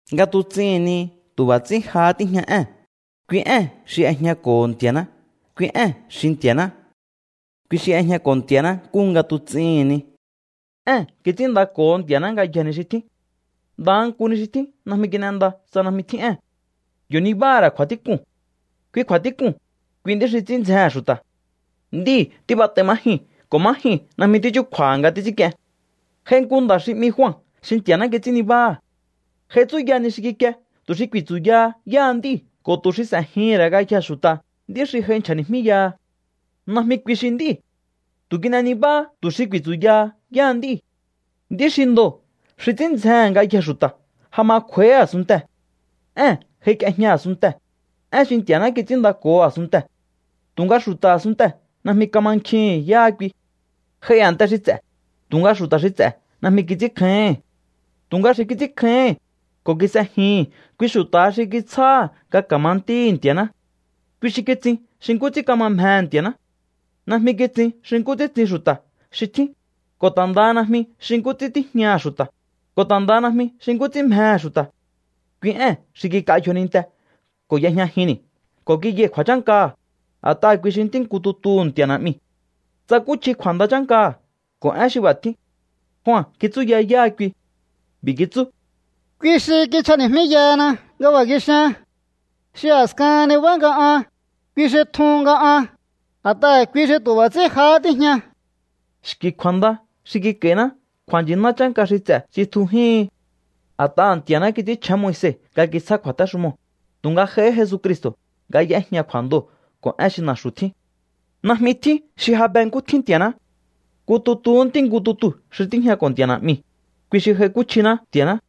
Nga tuts'ihi̱n ni tu̱ b'a̱ ts'ín jahá tíjña Ée̱n. Kui Ée̱n xi y'ejñako̱ho̱ Nti̱a̱ná. Kui Ée̱n xi Nti̱a̱ná. Kui xi y'ejñako̱ Nti̱a̱ná nkúhu nga tuts'ihi̱n ni. Ée̱n kits'ínndako̱ho Nti̱a̱ná ngayjee̱ ni xi tjín. Ndaha nku ni xi tjín najmi kin'enda tsa najmi tjín Ée̱n. Yo̱ nibáha̱ ra̱ kju̱a̱tík'un. Kui kju̱a̱tík'uu̱n, kui nd'í xi ts'ín ndzjehe̱n xu̱ta̱. Ndíi̱ tíb'at'ai má jyuu̱n ko̱ má jyuu̱n najmi tíchúkju̱a̱ha̱ nga títs'ínk'ien. J'ai nku nda̱ xi 'mi Jua xi Nti̱a̱ná kits'ín nibáha̱. J'ai tsúya ni xi kikie tu̱ xi ku̱i̱tsu̱yaha yáha nd'íu̱ ko̱ tu̱ xi s'e̱jihi̱n ra̱ ngayjee̱ xu̱ta̱ nd'í xi j'ai nchja̱ni̱jmíyaha. Najmi kui xi nd'íu̱. Tu̱ kin'e nibáhá tu̱ xi ku̱i̱tsu̱yaha yáha nd'íu̱. Nd'í xi ndoo̱ xi ts'ín ndzjehe̱n ngayjee̱ xu̱ta̱ ja ma kj'u̱a̱íhí a̱sunntee̱. Ée̱n j'aik'iejña a̱sunntee̱, Én xi Nti̱a̱ná kits'ínndako̱ho a̱sunntee̱. Tu̱nga xu̱ta̱ a̱sunntee̱ najmi kamankjihi̱n yáha kui. J'ai a̱nte xi ts'e̱, tu̱nga xu̱ta̱ xi ts'e̱ najmi kits'ínkjáíhi̱n. Tu̱nga xi kits'ínkjáíhi̱n ko̱ kis'ejihi̱n, kui xu̱ta̱ha xi kitsjáha̱ nga ka̱ma ntíhi̱ Nti̱a̱ná. Kui xi kitsin xi nkú ts'ín kama mjehe̱ Nti̱a̱ná. Najmi kitsin xi nkú ts'ín tsin xu̱ta̱ xi tjín, ko̱ ta̱ ndaha najmi xi nkú ts'ín tíjñaha̱ xu̱ta̱, ko̱ ta̱ ndaha najmi xi nkú ts'ín mjehe̱ xu̱ta̱. Kui Ée̱n xi kik'a yjoninte ko̱ y'ejñajinni̱ ko̱ kiyai̱ kju̱a̱chánkaha̱, a̱t'aha̱ kui xi Ntí nku tutuhu̱ Nti̱a̱ Na̱'miu̱. Tsakúchji kju̱a̱nda chánkaha̱ ko̱ én xi b'a̱ tjíu̱n. Jua kitsúya yáha kui. B'i̱ kitsú: —Kui xi kinchjani̱jmíyahana nga b'a̱ kixian: “Xi a̱skahan nibá nga an, kui xi tjun nga an, a̱t'aha̱ kui xi tu̱ b'a̱ ts'ín jahá tíjña.” Xki̱ kju̱a̱nda xi kik'a̱i̱ná kju̱a̱nchi̱ná chánka xi ts'e̱ tsitjujihin. A̱t'aha̱ Nti̱a̱ná kits'ínchjén Moise nga kitsjá kju̱a̱téxumoo̱, tu̱nga j'aihí Jesucristo̱ nga y'éjña kju̱a̱ndoo̱ ko̱ én xi na̱xu̱ tjín. Najmi tjín xi ja be nkú tjín Nti̱a̱ná. Nku tutuhú Ntí nku tutuu̱ xi tíjñako̱ Nti̱a̱ Na̱'miu̱, kui xi j'aikúchjiná Nti̱a̱ná.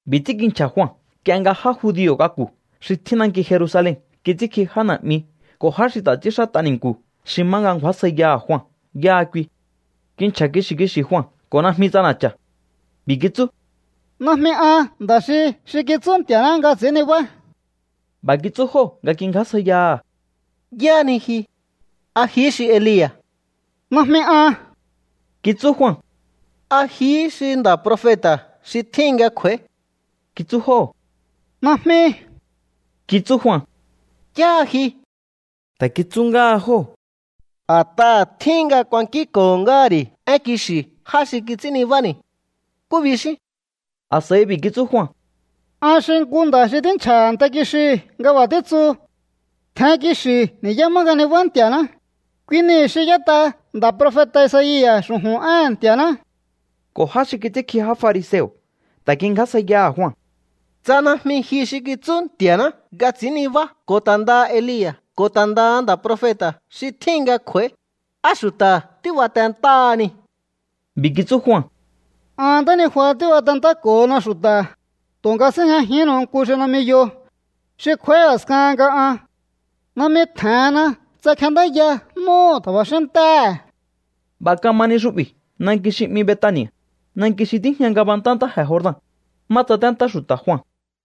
B'i̱ ts'ín kinchja̱ Jua nk'ie nga já judio̱ k'aku̱ xi tjín nanki Jerusalen kits'ínkji já na̱'mi ko̱ já xi ta̱ ts'ínxát'a ni̱nku̱ xi má nga ngju̱ásjaiyaha̱ Jua yáha kui. Kinchja̱ kixi̱ kixi̱ Jua ko̱ najmi ts'ana̱cha̱. B'i̱ kitsú: —Najmi an nda̱ xi xi kitsú Nti̱a̱ná nga ts'i̱ín nibá. B'a̱ kitsú jóo̱ nga kingjásjaiyaha̱: —¿Yáhá ni ji? ¿A jihí xi Elia̱? —Najmi an —kitsú Jua. —¿A jihí xi nda̱ profeta̱ xi tjíhin nga kj'u̱a̱í? —kitsú jóo̱. —Najmi —kitsú Jua. —¿Yáha ji? —ta̱ kitsú ngáha jóo̱—. A̱t'aha̱ tjíhin nga kuankínko̱ ngáha̱ ri̱ én kixi̱ já xi kits'ín nibáni̱. ¿Nkú bixín? A̱s'a̱i b'i̱ kitsú Jua: —An xi nku nda̱ xi tínchja̱ a̱nte kixiu̱ nga b'a̱ títsu: “Tjen kixi̱u ni̱yá má nga nibá Nti̱a̱ná.” Kui niu̱ xi y'ét'a nda̱ profeta̱ Isaia̱ xu̱ju̱n éhe̱n Nti̱a̱ná. Ko̱ já xi kits'ínkji já fariseo̱ ta̱ kingjásjaiyaha̱ Jua: —Tsa najmi ji xi kitsú Nti̱a̱ná nga ts'i̱ín nibá ko̱ ta̱ ndaha Elia̱ ko̱ ta̱ ndaha nda̱ profeta̱ xi tjíhin nga kj'u̱a̱í, ¿á xu̱ta̱ tíbatentáhani? B'i̱ kitsú Jua: —An ntánijua tíbatentáko̱hona xu̱ta̱, tu̱nga síjñajihínnu̱u nku xi najmi yo, xi kj'u̱a̱í a̱skahan nga an. Najmi tje̱henna tsa kjendáya n'úhu̱ tja̱ba̱xín ntéhe̱. B'a̱ kama ni xu'bi̱ nanki xi 'mi Betani̱a̱, nanki xi tíjña ngabantá ntáje̱ Jordan, má tsaténtá xu̱ta̱ Jua.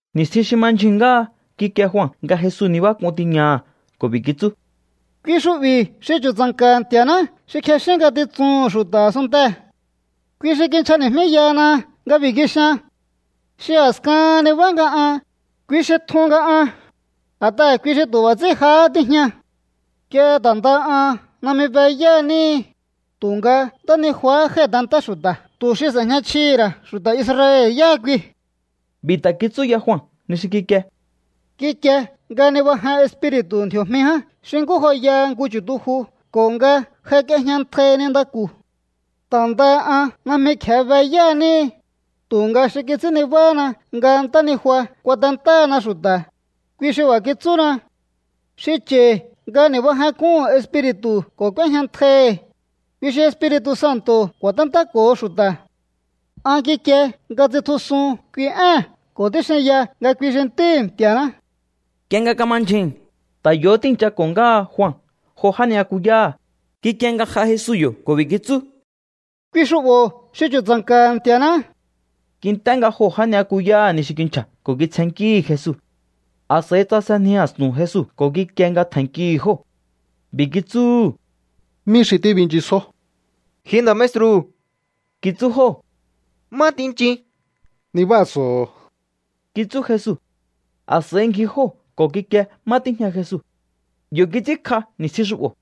Ni̱stjin xi ma ndyjuu̱n ngáha kikie Jua nga Jesu nibák'un tiñaha̱ ko̱ b'i̱ kitsú: —Kui xu'bi̱ xi chu̱tsa̱nka̱ha̱ Nti̱a̱ná xi kjexín ngatitsuhu̱n xu̱ta̱ a̱sunntee̱. Kui xi kinchjani̱jmíyahana nga b'i̱ kixian: “Xi a̱skahan nibá nga an, kui xi tjun nga an, a̱t'aha̱ kui xi tu̱ b'a̱ ts'ín jahá tíjña.” Nk'ie ta̱ ndaha an najmi be yá níhi, tu̱nga ntánijuahá jái̱tentá xu̱ta̱ tu̱ xi s'e̱jña chjihi̱ ra̱ xu̱ta̱ Israel yáha kui. B'i̱ ta̱ kitsúya Jua ni xi kikie: —Kikie nga nibajen Espiri̱tu̱ ndji̱o̱jmi ján xi nkú joyaha nku chu̱tuju ko̱ nga j'aik'iejñantjai nintaku̱. Ta̱ ndaha an najmi kje̱e be yá níhi, tu̱nga xi kits'ín nibáhána nga ntánijua kuatentáhana xu̱ta̱, kui xi b'a̱ kitsúna: “Xi cha̱i̱ nga ni̱bajenk'uhu̱n Espiri̱tu̱ ko̱ k'úéjñantjaihi̱, kui xi Espiri̱tu̱ Santo̱ ku̱a̱téntáko̱ho xu̱ta̱.” An kikie nga tsitjusun kui ée̱n ko̱ tíxinya nga kui xi Ntíhi̱ Nti̱a̱ná. Nk'ie nga kama ndyjuu̱n, ta̱ yo̱hó tíi̱nchako̱ ngáha Jua jo já ni'yakuyáha̱. Kikie nga j'a Jesu yo̱ ko̱ b'i̱ kitsú: —Kui xu'bo̱ xi chu̱tsa̱nka̱ha̱ Nti̱a̱ná. Kint'é nga joo̱ já ni'yakuyáha̱ ni xi kinchja̱ ko̱ kitsjennkíhi̱ Jesu. A̱s'a̱i tsasenji a̱stu̱n Jesu ko̱ kikie nga tje̱nnkihi̱ jóo̱. B'i̱ kitsúhu̱: —¿Mí xi tíbinchisjó? —Ji nda̱ maestru̱ —kitsú jóo̱—, ¿má tinchin? —Nibáa̱so̱ho̱o —kitsú Jesu. A̱s'a̱i ngji jóo̱ ko̱ kikie má tíjña Jesu. Yo̱ kits'ínkj'a ni̱stjin xu'bo̱,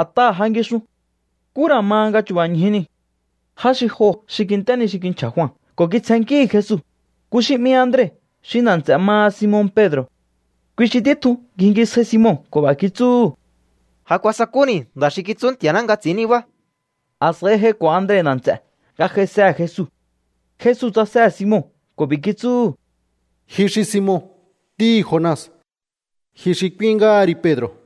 a̱t'aha̱ ja ngixun. Nkú ra̱ ma nga chu̱ba̱ ñju niu̱. Já xi joo̱ xi kint'é ni xi kinchja̱ Jua ko̱ kitsjennkíhi̱ Jesu, nku xi 'mi Andre xi nda̱ nts'e̱ maha Simon Pedro̱. Kui xi títjun ngjingisjai Simon ko̱ b'a̱ kitsúhu̱: —Ja kuasakúni̱ nda̱ xi kitsú Nti̱a̱ná nga ts'i̱ín nibá. A̱s'a̱i j'aiko̱ Andre nda̱ nts'e̱ nga j'aisehe̱ Jesu. Jesu tsasehe̱ Simon ko̱ b'i̱ kitsúhu̱: —Ji xi Simon, ntíhi̱ Jona. Ji xi k'úín ngáha ri Pedro̱.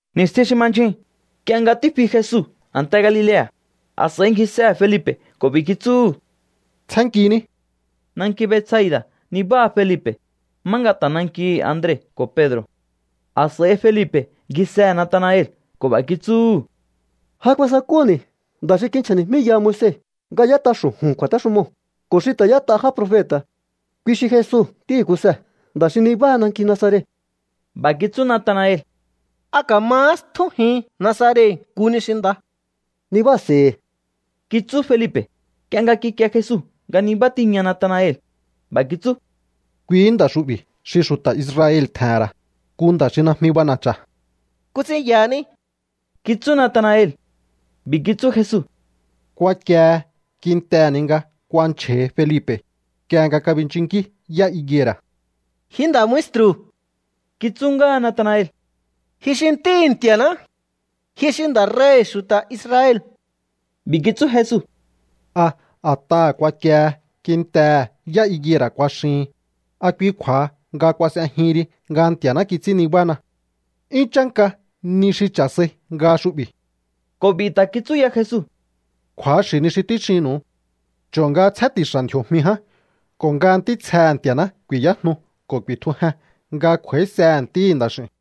Ni̱stjin xi ma ndyjuu̱n, nk'ie nga tífi Jesu a̱nte Galilea̱, a̱s'a̱i ngjisehe̱ Felipe̱ ko̱ b'i̱ kitsúhu̱: —Tsjénnkiní. Nanki Betsaida̱ nibáha Felipe̱, má nga ta̱ nankihi̱ Andre ko̱ Pedro̱. A̱s'a̱i Felipe̱ ngjisehe̱ Natanael ko̱ b'a̱ kitsúhu̱: —Ja kuasakúni̱ nda̱ xi kinchja̱ni̱jmíyaha Moise nga y'ét'a xu̱ju̱n kju̱a̱téxumoo̱ ko̱ xi ta̱ y'ét'a já profeta̱. Kui xi Jesu ntíhi̱ Kuse, nda̱ xi nibáha nanki Nazaret. B'a̱ kitsú Natanael: —¿A ka̱mahá stjújin Nazaret nku ni xi nda? —Nibáa̱se̱i̱hi̱ —kitsú Felipe̱. Nk'ie nga kikie Jesu nga nibá tiña Natanael, b'a̱ kitsú: —Kuihí nda̱ xu'bi̱ xi xu̱ta̱ Israel tje̱he̱n ra̱, nku nda̱ xi najmi b'ana̱cha̱. —¿Nkú ts'ín yahaní? —kitsú Natanael. B'i̱ kitsú Jesu: —Kuakiehe kintehe̱ ni nga kuanchja̱hi Felipe̱, nk'ie nga kabinchunnkí yá higuera̱. —Ji nda̱ maestru̱ —kitsú ngáha Natanael—, ji xi Ntíhi̱ Nti̱a̱ná. Ji xi nda̱ rei̱hi̱ xu̱ta̱ Israel. B'i̱ kitsú Jesu: —¿A a̱t'aha̱ kuakiehe kintehe̱ yá higuera̱ kuaxihin, a kui kju̱a̱ha nga kuas'ejihin ri nga Nti̱a̱ná kits'ín nibáhana? 'Yún chánka ni xi cha̱ sai nga xu'bi̱. Ko̱ b'i̱ ta̱ kitsú ya Jesu: —Kju̱axi̱ ni xi tíxinnu̱u. Cho̱o nga tsjén ti̱xa̱ ndji̱o̱jmi ján ko̱ nga ntítsjehe̱ Nti̱a̱ná ku̱i̱yájnu ko̱ ku̱i̱tjujen nga kj'u̱a̱ísehe̱ Ntíhi̱ Nda̱x'i̱u̱n.